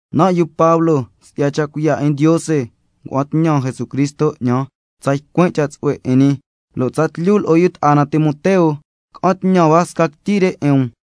Nan' yu Pablo, si'ya cha' cuiya' 'in Ndiose ngua'an tñan Jesucristo 'ñan tsa ycuin' cha' tsu'hue 'in ñi, lo' tsatlyu lo'o yu ta'a na Timoteo ca'an tñan hua sca quityi re 'in um,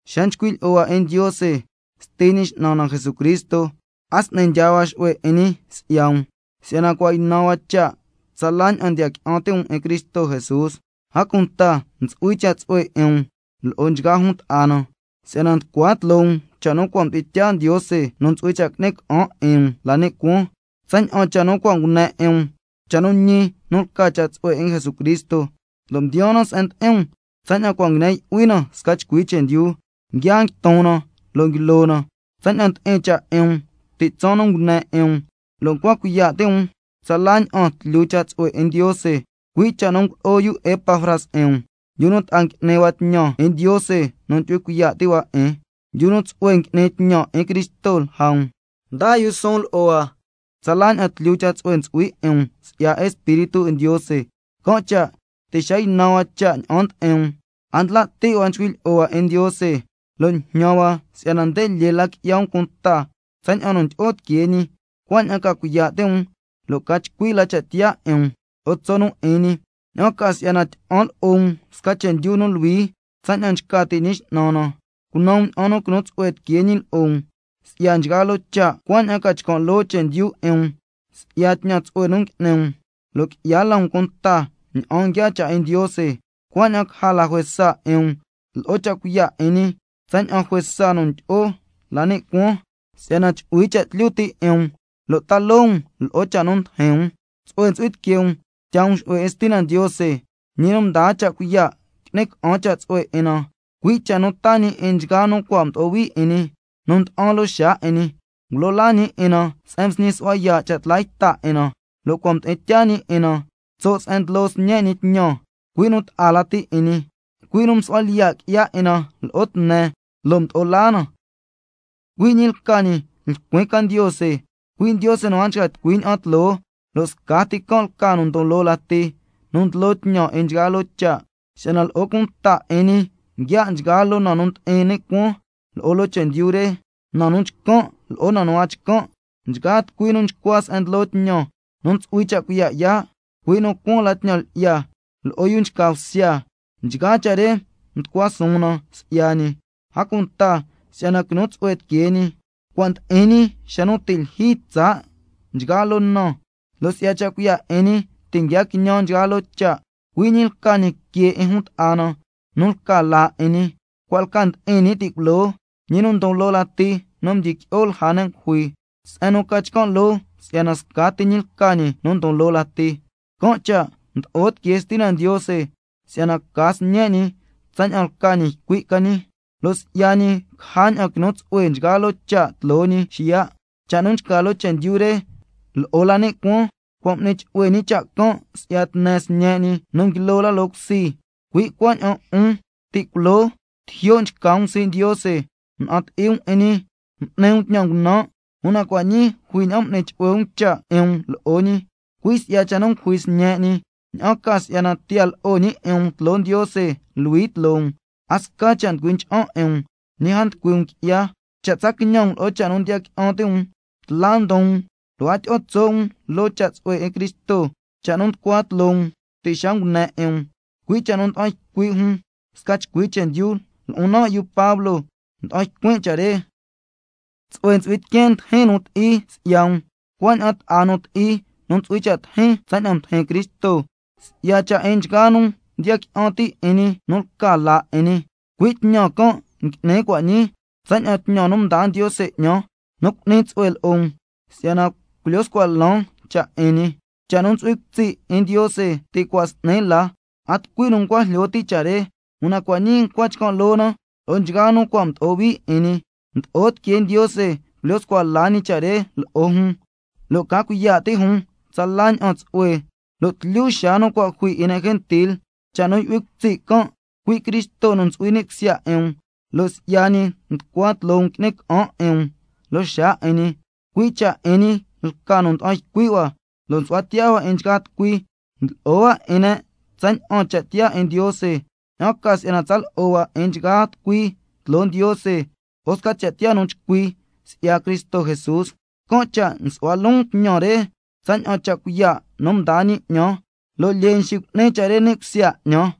Xa nchcui' lyi'o hua 'in Ndiose, Sti Ñi X'nan na Jesucristo, a s'ni ndyaa hua xu'hue 'in ñi si'ya um, si'yana cua' ynan hua cha' tsala ña'an ndiya qui'an ti' um 'in Cristo Jesús, a cunta ntsu'hui cha' tsu'hue 'in um lo'o nchgaa jun ta'a na, si'yana nducua tloo um cha' nu cua' mdi'in tyaa Ndiose nu ntsu'hui cha' qui'ni ca'an 'in um la ni' cuaan, tsaña'an cha' nu cua' ngune 'in um, cha' nu ñi nu lca cha' tsu'hue 'in Jesucristo, lo' mdiyaan na se'en ndi'in um tsaña'an cua' nguine yu'hui na sca chcui chendyu, nguia nguiton na, lo' nguilo na tsaña'an ndi'in cha' 'in um ti' tsaan nu ngune 'in um, lo' ncua cuiya' ti' um tsala ña'an tlyu cha' tsu'hue 'in Ndiose, cui' cha' nu ngulo'o yu Epafras 'in um, yu nu ta'a ngui'ni hua tñan 'in Ndiose nu ndyu'hui cuiya' ti' hua 'in, yu nu tsu'hue ngui'ni tñan 'in Cristo lja um, ndaa yu suun lo'o hua tsala ña'an tlyu cha' tsu'hue ntsu'hui 'in um si'ya Espíritu 'in Ndiose. Can' cha' ti' xa ynan hua cha' ña'an ndi'in um, a ndla' ti' hua chcui' lyi'o hua 'in Ndiose lo' njñan hua si'yana nde lyee la qui'ya um cunta tsaña'an nu ndyi'o tiquee ñi, cuaña'an ca cuiya' ti' um lo' ca chcui la cha' tiyaa 'in um lo'o tso' nu 'in ñi, ña'an ca si'yana tyi'an lo'o um sca chendyu nu luhui tsaña'an nchca ti' Ñi X'nan na, cunan um ña'an nu quinu tsu'hue tiquee ñi lo'o um si'ya nchgaa loo cha', cuaña'an ca chcan' loo chendyu 'in um si'ya tñan tsu'hue nu ngui'ni um, lo' qui'ya la um cunta tsaña'an nguiaa cha' 'in Ndiose, cuaña'an caja la juesa 'in um lo'o cha' cuiya' 'in ñi, tsaña'an juesa nu ndyi'o la ni' cuaan, si'yana chu'hui cha' tlyu ti' 'in um lo' ta loo um lo'o cha' nu ndijin um, tsu'hue ntsu'hui tiquee um tyaa um xu'hue 'in Stina Ndiose, ñi nu mdaa cha' cuiya' qui'ni ca'an cha' tsu'hue 'in na, cui' cha' nu taa ñi 'in nchgaa nu cua' mdo'o hui 'in ñi, nu nda'an loo xaa 'in ñi. Ngulo laa ñi 'in na se'en msñi su'hua yaa' cha' tla yta 'in na, lo' cua' mdi'in tyaa ñi 'in na tso' se'en ndlo Sñe' ñi tñan, cui' nu ta'a lati 'in ñi, cui' nu msu'hua lyiya' qui'ya 'in na lo'o tne, lo' mdo'o laa na. Cui' ñi lca ñi lcuin ca Ndiose, cui' Ndiose nu a nchca tucui ña'an tloo, lo' scati can' lca nu ndon loo lati nu ndlo tñan 'in nchgaa loo cha'. Si'yana lo'o cunta 'in ñi nguia' nchgaa loo na nu ndi'in ni' cuaan lo'o loo chendyu re, na nu chcan' lo'o na nu a chcan', nchgaa tucui nu nchcua se'en ndlo tñan, nu ntsu'hui cha' cuiya' yaa', cui' nu cuaan la tñan lyi'ya, lo'o yu nchca bsya, nchgaa cha' re mducua suun na si'ya ñi, a cunta si'yana quinu tsu'hue tiquee ñi. Cua' ndi'in ñi xa nu ti' lyijyi tsaa' nchgaa loo na, lo' si'ya cha' cuiya' 'in ñi ti' nguia quiñan nchgaa loo cha'. Cui' ñi lca ñi que 'in jun ta'a na nu lca laa 'in ñi, cua' lca ndi'in ñi ti' culoo, ñi nu ndon loo lati nu mdyiqui'o lja ne' ngujui, se'en nu ca chcan' loo si'yana scati ñi lca ñi nu ndon loo lati, can' cha' mdo'o tiquee Stina Ndiose si'yana ca Sñe' ñi tsaña'an lca ñi ycui' ca ñi, lo' si'ya ñi caja ña'an quinu tsu'hue nchgaa loo cha' tloo ñi xiya', cha' nu nchca loo chendyu re lo'o la ni' cuaan, cua' m'ni chu'hue ñi cha' can' si'ya tne Sñe' ñi nu nguilo la loo cusi. Cui' cuaña'an 'un, ti' culoo tijyo' nchca um sii' Ndiose, mna'an ti'i um 'in ñi, m'ni um tñan ngunan', una cua' ñii jui ña'an m'ni chu'hue um cha' 'in um lo'o ñi, cui' si'ya cha' nu ngujui Sñe' ñi, ña'an ca si'yana tiya lo'o ñi 'in um tloo Ndiose luhui tloo um, a sca cha' nducui ncha'an 'in um, ñi a nducui 'a um qui'ya, una cha' tsa quiñan um lo'o cha' nu ndiya qui'an ti' um, tla ndon um lo' a tyi'o tso' um loo cha' tsu'hue 'in Cristo, cha' nu nducua tloo um ti' xa ngune 'in um, cui' cha' nu nda'an ycui' ne' sca chcui chendyu, lo'on nan' yu Pablo nda'an ycuin' cha' re. Tsu'hue ntsu'hui tiqueen ndijin nu ti'i si'ya um, cuaña'an ta'a nu ti'i nu ntsu'hui cha' tijin tsaña'an mdijin Cristo, si'ya cha' 'in nchgaa nu ndiya qui'an ti' 'in ñi nu lca laa 'in ñi, cui' tñan can' ngui'nin cua' ñii, tsaña'an tñan nu mdaa Ndiose 'ñan nu cu'ni tsu'hue lo'o um, si'yana culyo scua lan cha' 'in ñi, cha' nu ntsu'hui cutsi' 'in Ndiose ti' cua' s'ni la, a tucui nu ncua jlyo ti' cha' re, una cua' ñii ncua chcan' loo na lo'o nchgaa nu cua' mdo'o hui 'in ñi, mdo'o tiquee Ndiose culyo scua la ñi cha' re lo'o jun, lo' ca cuiya' ti' jun tsala ña'an tsu'hue lo' tlyu xaa nu cua' jui 'in ne' gentil, cha' nu yu'hui cutsi' can', cui' Cristo nu ntsu'hui ni' cusya 'in um, lo' si'ya ñi nducua tloo um qui'ni ca'an 'in um loo xaa 'in ñi. Cui' cha' 'in ñi lca nu nda'an ycui' hua lo' nsu'hua tiyaa hua 'in nchgaa tucui, ndlo'o hua 'in ne' tsaña'an cha' tiyaa 'in Ndiose, ña'an ca si'yana tsa lo'o hua 'in nchgaa tucui tloo Ndiose lo'o sca cha' tiyaa nu chcui si'ya Cristo Jesús. Can' cha' nsu'hua loon tñan re tsaña'an cha' cuiya' nu ndaa ñi 'ñan, lo' lyee nxicu'ni cha' re ni' cusya 'ñan.